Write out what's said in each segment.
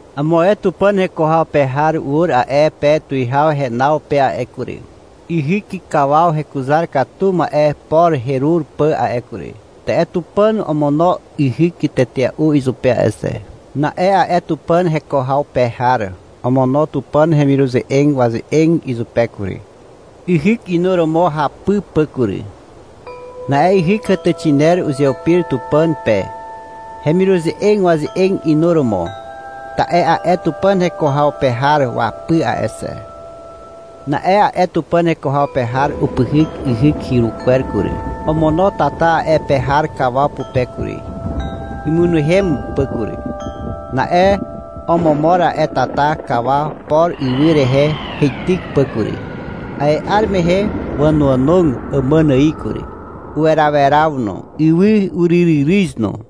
Amo ae Tupàn heko haw pe har ur a'e pe tuwihaw henaw pe a'e kury, yhyk kawaw hekuzar katu ma'e por herur pà a'e kury. Ta'e Tupàn omono yhyk tetea'u izupe a'e xe. Na'e a'e Tupàn heko haw pe har omono Tupàn hemiruze'eg waze'eg izupe kury, yhyk inuromo hapy pà kury. Na'e yhyk hàtàxiner uzeupir Tupàn pe, hemiruze'eg waze'eg inuromo, ta'e a'e Tupàn heko haw pe har wapy a'e xe. Na'e a'e Tupàn heko haw pe har upyhyk yhyk hyru kwer kury. Omono tata a'e pe har kawaw pupe kury, imynehem pà kury. Na'e omomor a'e tata kawaw por ywy rehe heityk pà kury. A'e 'ar mehe wànoànog àmàn ài kury. Uweraweraw no. Ywy uryryryryz no.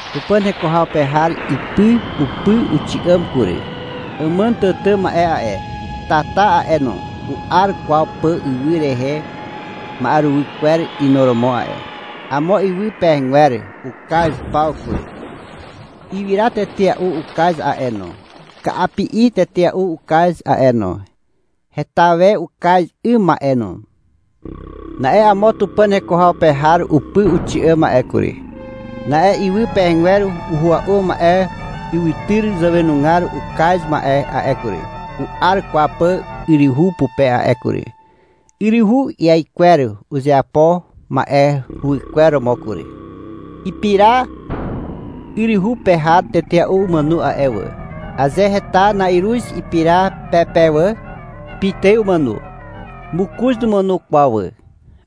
Tupàn heko haw pe har ipy upy uxi'àm kury. Àmàn tàtà ma'e a'e, tata a'e no, u'ar kwaw pà ywy rehe ma'eruwy kwer inuromo a'e. Amo ywy pehegwer ukaz paw kury. Ywyra tetea'u ukaz a'e no. Ka'api'i tetea'u ukaz a'e no. (Heta we ukaz 'ym ma'e no.) Na'e amo Tupàn heko haw pe har upy uxi'àm a'e kury. Na'e ywy pehegwer uhua'u ma'e ywytyr zàwenugar ukaz ma'e a'e kury, u'ar kwaw pà yryhu pupe a'e kury. Yryhu iaikwer uzeapo ma'e huwykwer romo kury. Ipira yryhu pe har tetea'u umàno a'e wà. Aze heta na'iruz ipira pe pe wà, pitài umàno. Mokoz numàno kwaw wà.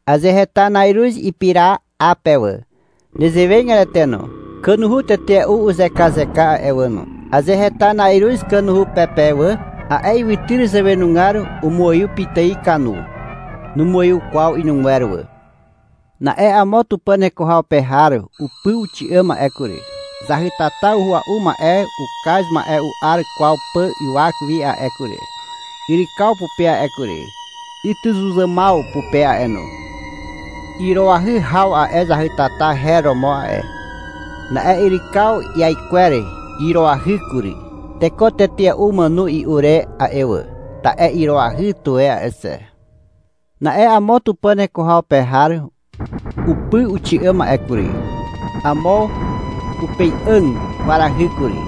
Aze heta na'iruz ipira 'a pe wà, nezewegatete no. Kanuhu tetea'u uzekazeka a'e wà no. Aze heta na'iruz kanuhu pe pe wà, a'e ywytyr zàwenugar umuaiw pitài kanu. Numuaiw kwaw inugwer wà. Na'e amo Tupàn heko haw pe har upy uxi'àm a'e kury. Zahytata uhua'u ma'e ukaz ma'e u'ar kwaw pà ywak wi a'e kury, yrykaw pupe a'e kury, ytyzuzàmaw pupe a'e no. (Iroahy haw a'e zahytata her romo a'e.) Na'e yrykaw iaikwer iroahy kury. Teko tetea'u umàno i'u re a'e wà, ta'e iroahy tuwe a'e xe. Na'e amo Tupàn heko haw pe har upy uxi'àm a'e kury. Amo upei'àg kwarahy kury,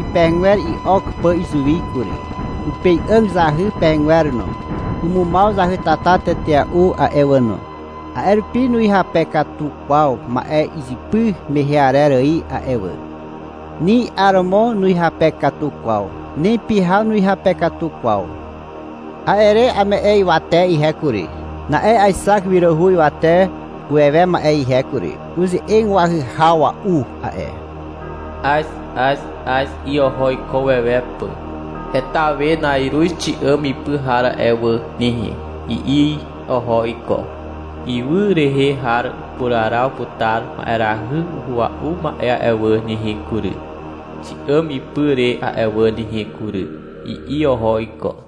ipehegwer i'ok pà izuwi kury. Upei'àg zahy pehegwer no. Umumaw zahytata tetea'u a'e wà no. A'e rupi nuhyape katu kwaw ma'e izypy mehe arer ài a'e wà. Ni 'aromo nuhyape katu kwaw. Ni pyhaw nuhyape katu kwaw. A'e re ame'e ywate ihe kury. Na'e aexak wiràhu ywate uwewe ma'e ihe kury. Uze'eg wahyhawa'u a'e. — Az, Az, Az, i'i oho iko uwewe pà. — Heta we na'iruz xi'àm ipy har a'e wà nehe, i'i oho iko. — Ywy rehe har upuraraw putar ma'erahy uhua'u ma'e a'e wà nehe kury, xi'àm ipy re a'e wà nehe kury, i'i oho iko.